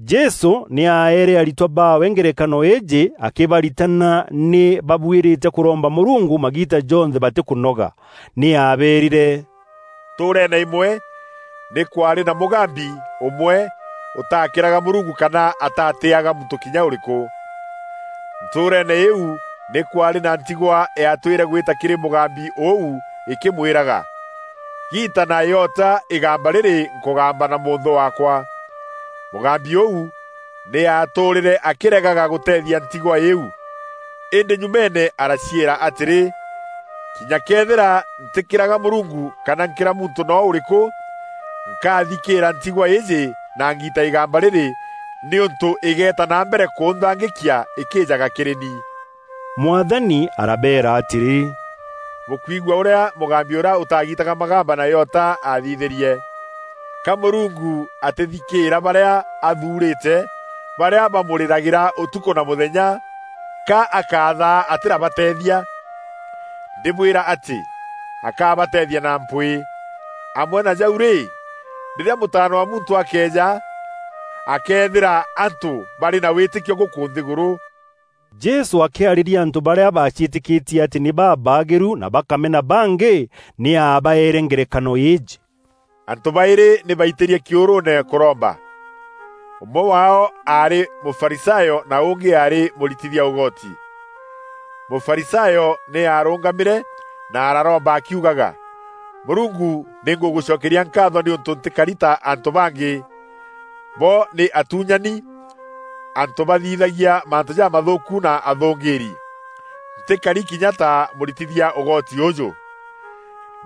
Jesû nî aeere aritwa baawe ngerekano îîjî akîbaritana nî babuîrîte kûromba Mûrungu magiita jonthe batîkûnoga. Nî aabeerîre, “Ntûûreene îmwe nî kwaarî na mûgambi ûmwe ûtakîraga Mûrungu kana atatîaga muntû kinya ûrîkû. Ntûûreene îîu nî kwaarî na ntigwa yaatwîre gwîta kîrî mûgambi ûu îkîmwîraga, ‘Giita na îota îgamba rîrî nkûgamba na mûnthû waakwa.’ Mûgambi ûu nî aatûrîre akîregaga gûteethia ntigwa îîu. Îndî nyumeene araciîra atîrî, ‘Kinya këethîra ntîkîraga Mûrungu kana nkîra muntû noo ûrîkû, nkathikîîra ntigwa îîjî na ngiite îgamba rîrî nîûntû îgeeta na mbere kûnthangîkia îkîîjaga kîrî ni.’” Mwathani arabeera atîrî, “Bûkwigua ûrîa mûgambi ûrîa ûtagiitaga magamba na îota aathithîrie. Ka Mûrungu atîthikîîra barîa athuurîte, barîa bamûrîragîra ûtukû na mûthenya? Ka akathaa atîrabateethia? Ndîbwîra atî, akabateethia na mpwîî. Amwe na jau rî, rîrîa Mûtaana wa Muntû akeeja, akeethîra antû barî na wîtîkio gûkû nthîgûrû?” Jesû akîarîria antû barîa baciîtîkîtie atî nî babaagîru na bakamena bangî, nî aabaeere ngerekano îîjî: “Antû baîrî nî baitîrie kîûrûûne kûromba. Ûmwe waao aarî Mûfarisayo na ûngî aarî mûritithia ûgoti. Mûfarisayo nî aarûngamîre na araromba akiugaga, ‘Mûrungu, nî ngûgûcokeria nkaatho nîûntû ntîkari ta antû bangî; bo nî atuunyani, antû bathithagia mantû jamathûûku na athûngîîri. Ntîkari kinya ta mûritithia ûgoti ûûjû.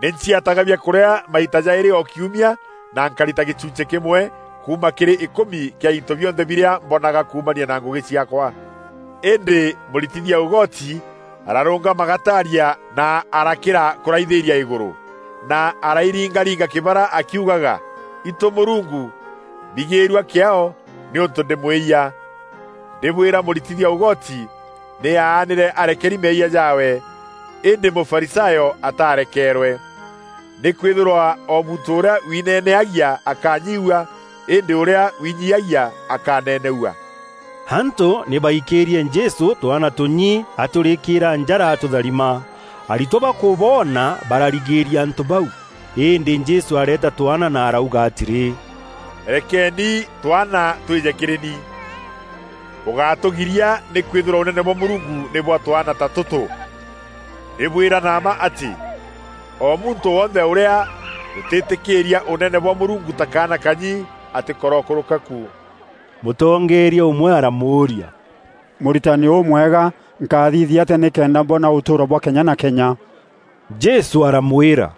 Nî nciataga biakûrîa maita jaîrî o kiumia na nkarita gîchunchî kîmwe kuuma kîrî îkûmi kîa into bionthe birîa mbonaga kuumania na ngûgî ciaakwa.’ Îndî mûritithia ûgoti ararûngama gataaria na arakîra kûraithîria îgûrû, na arairingaringa kîbara akîugaga, ‘Itû Mûrungu, mbigîîrua kîaao, nîûntû ndî mwîyia!’ Ndîbwîra mûritithia ûgoti nî aanîre arekeri meeyia jaawe, îndî Mûfarisayo atarekeerwe. Nîkwîthîrwa o muntû ûrîa wineneagia akanyiiua îndî ûrîa winyiiagia akaneneua.” Antû nî baikîîrie Jesû twana tûnyî atûrîîkîra njara atûtharima. Aritwa bakûboona bararigîria antû bau. Îndî Jesû areeta twaana na arauga atîrî, “Rekeeni twaana twîje kîrî ni. Bûgátûgiiria nîkwîthîrwa Ûnene bwa Mûrungu nî bwa twaana ta tûtû. Ndîbwîra na mma atî, o muntû wonthe ûrîa ûtîtîkîîria Ûneneene bwa Mûrungu ta kaana kanyi, atîkorokûrûka ku.” Mûtongeeria ûmwe aramûûria, “Mûritani ûmwega, nkathithia atîa nîkenda mboona ûtûûro bwa kenya na kenya?” Jesû aramwîra,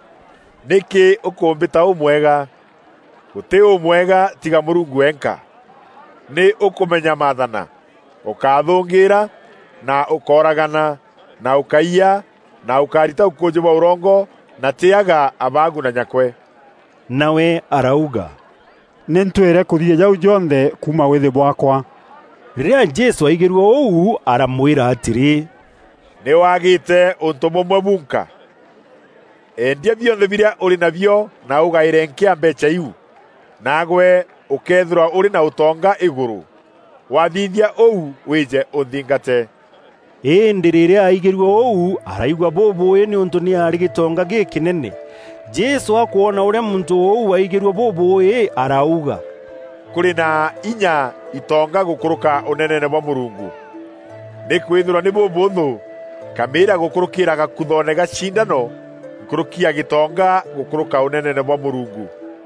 “Nîkî ûkûmbîta ûmwega? Gûtî ûmwega tiga Mûrungu wenka. Nî ûkûmenya Maathana: Ûkáthûngîîra, na Ûkóragana, na Ûkáiya, na Ûkárita ûkûûjî bwa ûrongo, na tîyaga abaagu na nyakwe.” Nawe arauga, “Nî ntwîre kûthithia jau jonthe kuuma wîthî bwaakwa.” Rîrîa Jesû aigîrue ûu, aramwîra atîrî, “Nî wagîîte ûntû bûmwe bunka. Endia bionthe birîa ûrî nabio na ûgaîre nkîa mbeecha îîu, naagwe ûkeethîrwa ûrî na ûtonga îgûrû. Wathithia ûu, wîje ûnthingate.” Îndî rîrîa aigîrue ûu araigua bûbûûî nîûntû nî aarî gîtonga gîkînene. Jesû akwona ûrîa muntû ûu aaigîrue bûbûûî arauga, “Kûrî na inya itonga gûkûrûka Ûneneene bwa Mûrungu! Nîkwîthîrwa nî bûbûûthû nkamîîra gûkûrûkîîra gakûthoone ga cindano, nkûrûki ya gîtonga gûkûrûka Ûneneene bwa Mûrungu.”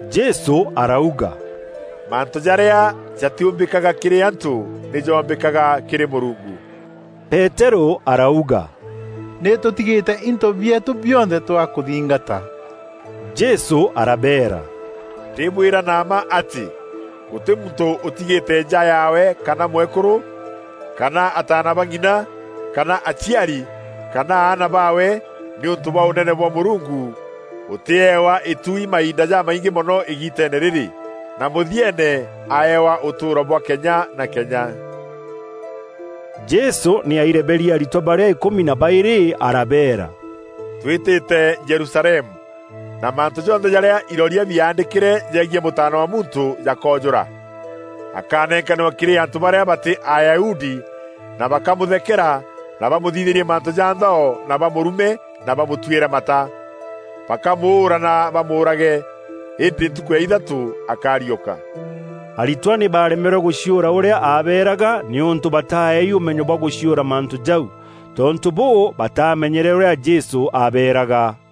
Jesû arauga, “Mantû jarîa jatîûmbîkaga kîrî antû nî joombîkaga kîrî Mûrungu.” Peterû arauga, “Nî tûtigîte into bieetû bionthe twakûthingata.” Jesû arabeera, “Ndîbwîra na mma atî, gûtî muntû ûtigîte nja yaawe kana mwekûrû, kana ataana ba ng'ina, kana aciari, kana aana baawe, nîûntû bwa Ûnene bwa Mûrungu, ûtîeewa îtuui mainda jamaingî mono îgiiteene rîrî, na mûthieene aewa ûtûûro bwa kenya na kenya.” Jesû nî aireberie aritwa barîa îkûmi na baîrî arabeera, “Twîtîte Jerusalemu, na mantû jonthe jarîa iroria biaandîkîre jegiî Mûtaana wa Muntû jakoojûra. Akanenkanîrwa kîrî antû barîa batî Ayahudi na bakamûthekera na bamûthithîrie mantû ja nthao na bamûrume na bamûtwîre mata. Bakamûûra na bamûûrage, îndî ntukû ya ithatû akariûka.” Aritwa nî baaremerwe gûciûra ûrîa aabeeraga nîûntû bataaeei ûmenyo bwa gûciûra mantû jau. Tontû bûû, batamenyere ûrîa Jesû abeeraga.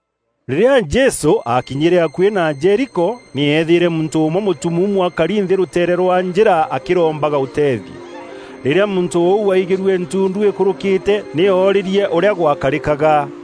Rîrîa Jesû aakinyîre akuî na Jeriko, nî eethîîre muntû ûmwe mûtumuumu akari nthî rûteere rwa njîra akîrombaga ûteethio. Rîrîa muntû ûu aigîrue ntundu îkûrûkîte nî oroorie ûrîa gwakarîkaga.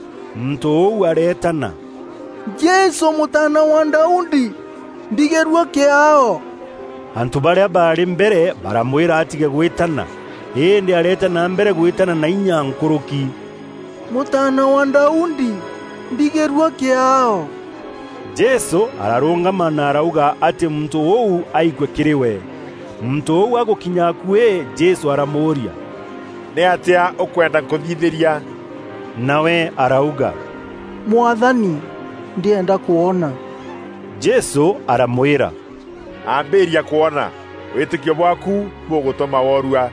Muntû ûu areetana, “Jesû Mûtaana wa Daudi, mbigîîrua kîaao!” Antû barîa baarî mbere baramwîra atîge gwîtana. Îndî areeta na mbere gwîtana na inya nkûrûki, “Mûtaana wa Daudi, mbigîîrua kîaao!” Jesû ararûngama na arauga atî muntû ûu aikue kîrî we. Muntû ûu agûkinya akuî, Jesû aramûûria, “Nîatîa ûkwenda nkûthithîria?” Nawe arauga, “Mwathani, ndîenda kwona.” Jesû aramwîra, “Ambîria kwona. Wîtîkio bwaaku bûgûtûma worua.”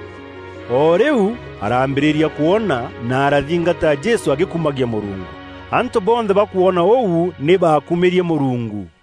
O rîu araambîrîria kwona na arathingata Jesû agîkumagia Mûrungu. Antû bonthe bakwona ûu, nî baakumîrie Mûrungu.